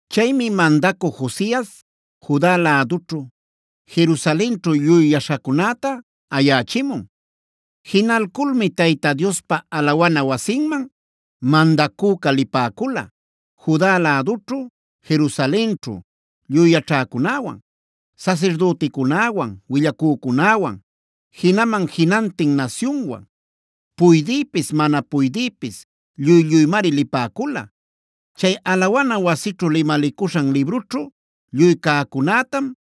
Chaymi mandacü Josias Juda lädućhu, Jerusalenćhu lluy yaśhacunäta ayächimun. Jinalculmi Tayta Diospa alawana wasinman mandacüca lipäcula: Juda lädućhu, Jerusalenćhu lluy yaćhäcunäwan, sasirdüticunäwan, willacücunäwan, jinaman jinantin nasyunwan. Puydïpis mana puydïpis lluy-lluymari lipäcula. Chay alawana wasićhu limalicuśhan librućhu lluy cäcunätam,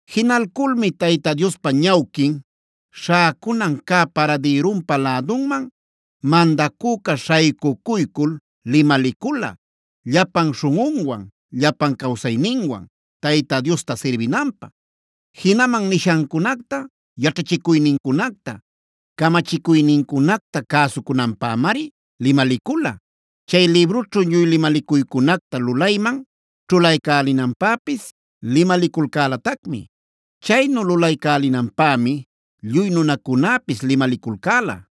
Jinalculmi Tayta Diospa ñawquin śhäcunan cä paradïrunpa lädunman mandacüca śhaycucuycul limalicula, llapan śhunꞌunwan, llapan cawsayninwan Tayta Diosta sirbinanpä. Jinaman nishancunacta, yaćhachicuynincunacta, camachicuynincunacta cäsucunanpämari limalicula. Chay librućhu lluy limalicuycunacta lulayman ćhulaycälinanpäpis limaliculcälatacmi. Chaynu lulaycälinanpämi lluy nunacunäpis limaliculcäla.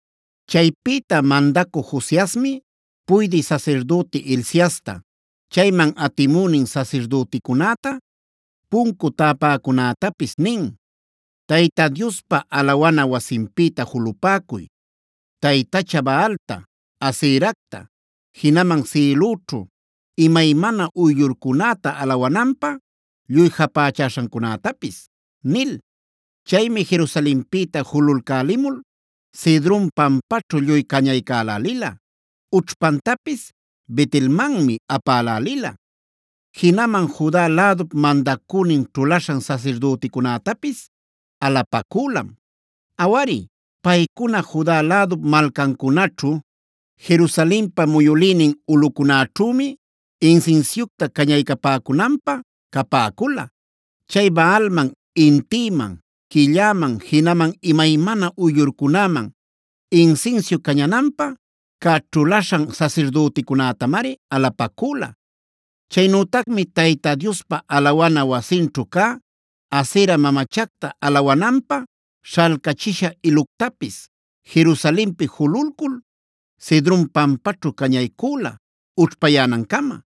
Chaypïta mandacü Josiasmi puydï sasirdüti Hilciasta, chayman atimünin sasirdüticunäta, puncu täpäcunätapis nin: Tayta Diospa alawana wasinpïta julupäcuy, taytacha Baalta, Aseracta, jinaman sïlüćhu imaymana uyllurcunäta alawananpä lluy japächaśhancunätapis” nil. Chaymi Jerusalenpïta julalcälimul Cedron pampaćhu lluy cañaycälälila; ućhpantapis Bet-elmanmi apälälila. Jinaman Juda lädup mandacünin ćhulaśhan sasirdüticunätapis alapacülam. Awari paycuna Juda lädup malcancunaćhu Jerusalenpa muyülïnin ulꞌucunäćhümi insinsiucta cañaycapäcunapä capäcula. Chay Baalman, intïman, quilläman, jinaman imaymana uyllurcunaman insinsiu cañananpä cä ćhulaśhan sasirdüticunätamari alapacüla. Chaynütacmi Tayta Diospa alawana wasinćhu cä Asera mamachacta alawananpä śhalcachisha iluctapis, Jerusalenpi jululcul Cedron pampaćhu cañaycüla ućhpayänancama.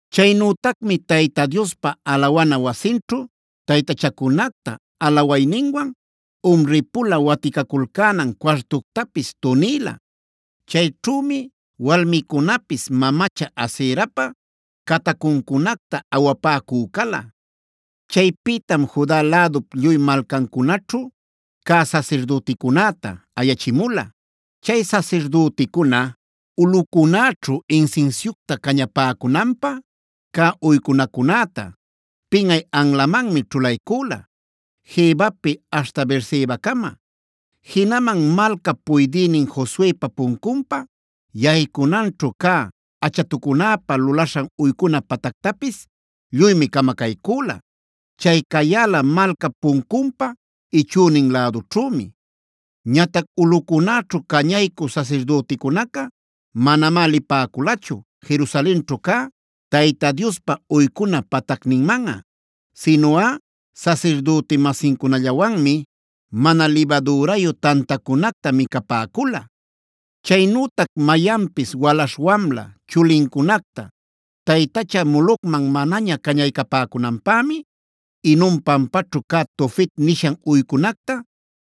Chaynütacmi Tayta Diospa alawana wasinćhu taytachacunacta alawayninwan umri-pula waticaculcänan cuartuctapis tunïla. Chayćhümi walmicunapis mamacha Aserapa catacuncunacta awapäcü cala. Chaypïtam Juda lädup lluy malcancunaćhu cä sasirdüticunäta ayachimula. Chay sasirdüticuna ulꞌucunäćhu insinsiucta cañapäcunanpä cä uycunacunäta, pinꞌay anlamanmi ćhulaycüla, Gebapi aśhta Beersebacama. Jinaman malcap puydïnin Josuepa puncunpa yaycunanćhu cä, achatucunäpä lulaśhan uycuna patactapis lluymi camacaycüla. Chay cayäla malcap puncunpa ichünin lädućhümi. Ñatac ulꞌucunäćhu cañaycü sasirdüticunaca, manamá lipäculachu Jerusalenćhu cä Tayta Diospa uycuna patacninmanꞌa. Sinuꞌa sasirdüti-masincunallawanmi, mana libadürayu tantacunacta micapäcula. Chaynütac mayanpis walaśh-wamla chulincunacta, taytacha Molocmanc manaña cañaycapäcunanpämi, Hinom pampaćhu cä Tofet nishan uycunacta,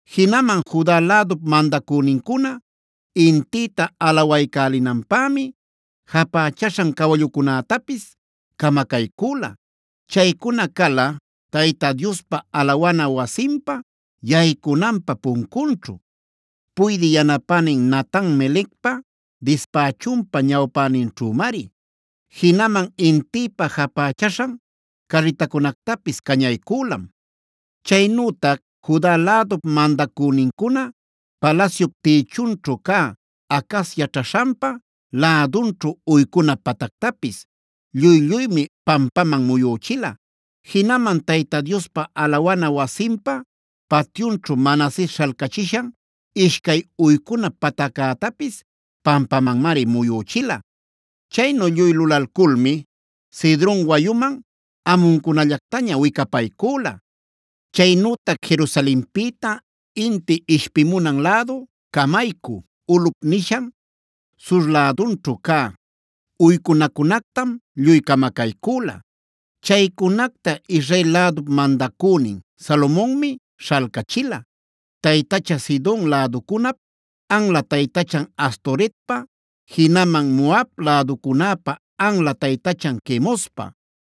Jinaman Juda lädup mandacünincuna intïta alawaycälinanpämi, japächaśhan cawallucunätapis camacaycüla. Chaycuna cala Tayta Diospa alawana wasinpa yaycunanpä puncunćhu, puydï yanapänin Natan-melecpa dispächunpa ñawpäninćhümari. Jinaman intïpä japächaśhan carritacunactapis cañaycülam. Chaynütac Juda lädup mandacünincuna palasyup tïchunćhu cä, Acaz yaćhaśhanpa lädunćhu uycuna patactapis lluy-lluymi pampaman muyüchila. Jinaman Tayta Diospa alawana wasinpa patyunćhue Manases śhalcachishan ishcay uycuna pataccätapis pampamanmari muyüchila. Chaynu lluy lulalculmi Cedron wayuman amuncunallactaña wicapaycüla. Chaynütac Jerusalenpïta inti ishpimunan lädu Camaycü Ulꞌupf nishan sur lädunćhu cä, uycunacunactam lluy camacaycüla. Chaycunacta Israel lädup mandacünin Salomonmi śhalcachila, taytacha Sidon läducunap anla taytachan Astoretpa, jinaman Moab läducunäpa anla taytachan Quemospa,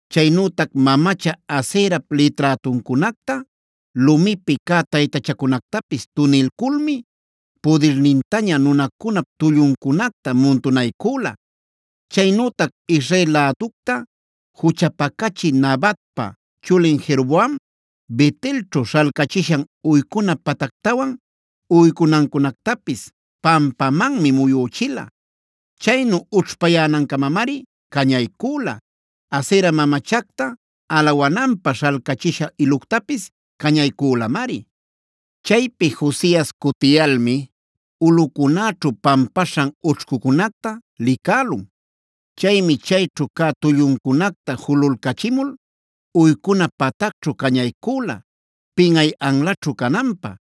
Chaynütac mamacha Aserap liträtuncunacta, lumipi cä taytachacunactapis tunilculmi pudirnintaña nunacunap tulluncunacta muntunaycüla. Chaynütac Israel läducta juchapacachï Nabatpah chulin Jeroboam, Bet-elćhu śhalcachishan uycuna patactawan uycunancunactapis, pampamanmi muyüchila. Chaynu ućhpayänancamamari cañaycüla. Asera mamachacta alawananpä śhalcachisha iluctapis cañaycülamari. Chaypi Josias cutiyalmi ulꞌucunäćhu pampaśhan ućhcucunacta licälun. Chaymi chayćhu cä tulluncunacta julalcachimul, uycuna patacćhu cañaycüla, pinꞌay anlaćhu cananpä.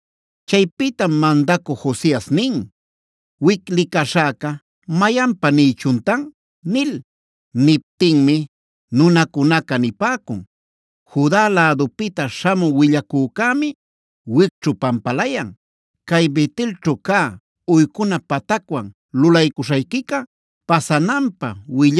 Chaypïtam mandacü Josias nin: “Wic licaśhäca ¿mayanpa nïchuntan?” nil. Niptinmi nunacunaca nipäcun: “Juda lädupïta śhamü willacücämi wicćhu pampalayan. Cay Bet-elćhu cä uycuna patacwan lulaycuśhayquica pasananpä,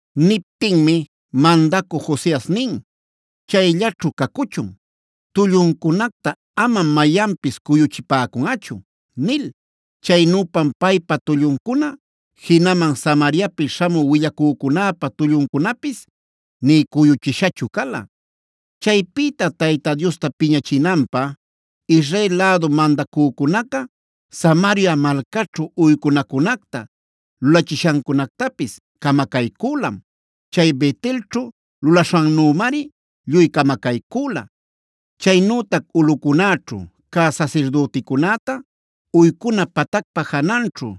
Niptinmi mandacü Josias nin: “Chayllaćhu cacuchun. Tulluncunacta amam mayanpis cuyuchipäcunꞌachu” nil. Chaynüpam paypa tulluncuna, jinaman Samariapi śhamü willacücunäpa tulluncunapis nï cuyuchishachu cala. Chaypïta Tayta Diosta piñachinanpä Israel lädu mandacücunaca Samaria malcaćhu uycunacunacta lulachishancunactapis camacaycülam. Chay Bet-elćhu lulaśhannümari lluy camacaycüla. Chaynütac ulꞌucunäćhu cä sasirdüticunäta uycuna patacpa jananćhu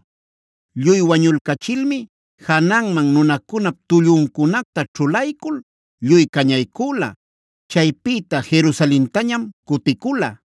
lluy wañulcachilmi, jananman nunacunap tulluncunacta ćhulaycul lluy cañaycüla. Chaypïta Jerusalentañam cuticula.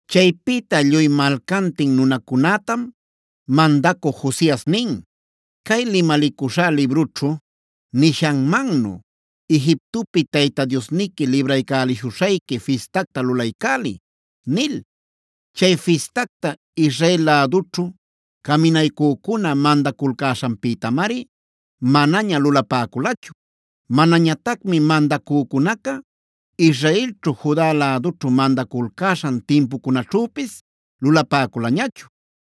Chaypïta lluy malcantin nunacunätam mandacü Josias nin: “Cay limalicuśhá librućhu nishanmannu, Egiptopi Tayta Diosniqui Libraycäliśhuśhayqui Fistactak lulaycäliy” nil. Chay fistacta, Israel lädućhu caminaycücuna mandaculcäśhanpïtamari manaña lulapäculachu. Manañatacmi mandacücunaca, Israelćhu Juda lädućhu mandaculcäśhan timpucunaćhüpis lulapäculañachu.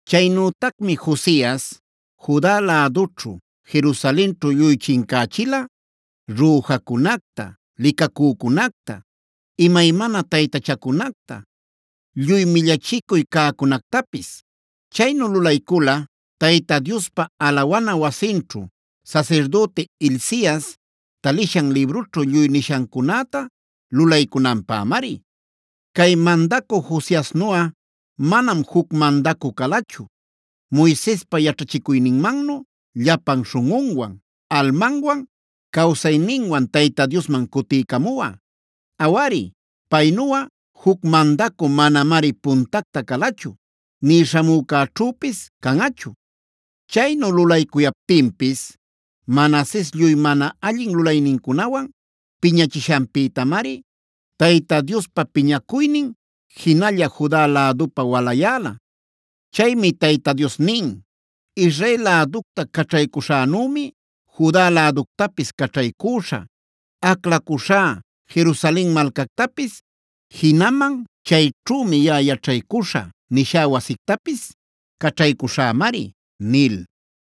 Chaynütacmi Josias, Juda lädućhu Jerusalenćhu lluy chincächila: rüjacunacta, licacücunacta, imaymana taytachacunacta, lluy millachicuy cäcunactapis. Chaynu lulaycula Tayta Diospa alawana wasinćhu, sasirdüti Hilcias talishan librućhu lluy nishancunäta lulaycunanpämari. Cay mandacü Josiasnuꞌa, manam juc mandacü calachu Moisespa yaćhachicuyninmannu llapan śhunꞌunwan, almanwan, cawsayninwan Tayta Diosman cutiycamuꞌa. Awari paynuꞌa juc mandacü manamari puntacta calachu, nï śhamücäćhüpis canꞌachu. Chaynu lulaycuyaptinpis Manases lluy mana allin lulaynincunawan piñachishanpïtamari, Tayta Diospa piñacuynin jinalla Juda lädupä walayäla. Chaymi Tayta Dios nin: “Israel läducta caćhaycuśhänümi Juda läductapis caćhaycüśhä. Aclacuśhá Jerusalen malcactapis, jinaman chayćhümi yaꞌa yaćhaycuśhä nishá wasictapis caćhaycuśhämari” nil.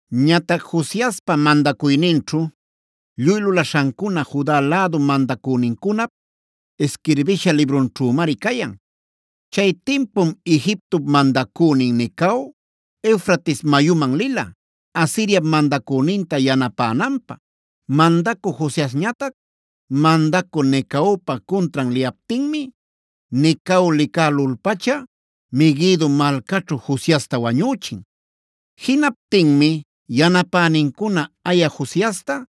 Ñatac Josiaspa mandacuyninćhu lluy lulaśhancuna Juda lädu mandacünincunap isquirbisha librunćhümari cayan. Chay timpum Egiptop mandacünin Necao, Eufrates mayuman lila, Asiriap mandacüninta yanapänanpä. Mandacü Josiasñatac mandacü Necaopa cuntran liyaptinmi, Necao licälul-pacha Meguido malcaćhu Josiasta wañüchin. Jinaptinmi yanapänincuna aya Josiasta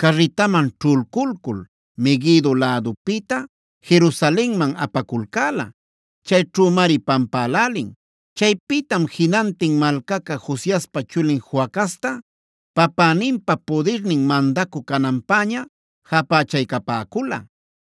carritaman ćhulculcul, Meguido lädupïta Jerusalenman apaculcäla. Chayćhümari pampälälin. Chaypïtam jinantin malcaca Josiaspa chulin Joacazta, papäninpa pudirnin mandacü cananpäña japächaycapäcula.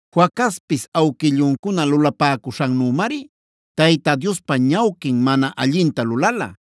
Joacazpis awquilluncuna lulapäcuśhannümari, Tayta Diospa ñawquin mana allinta lulala.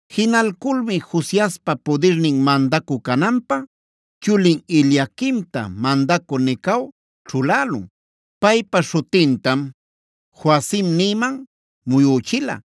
Jinalculmi Josiaspa pudirnin mandacü cananpä, chulin Eliaquimta mandacü Necao ćhulälun. Paypa śhutintam Joacim nïman muyüchila.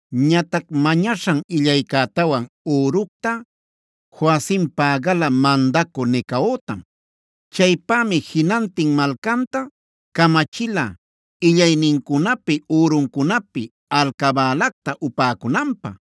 Ñatac mañaśhan illaycätawan üructa Joacim pägala mandacü Necaotam. Chaypämi jinantin malcanta camachila illaynincunapi üruncunapi alcabälacta upäcunanpä.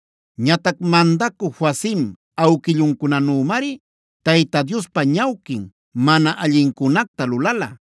Ñatac mandacü Joacim awquilluncunanümari Tayta Diospa ñawquin mana allincunacta lulala.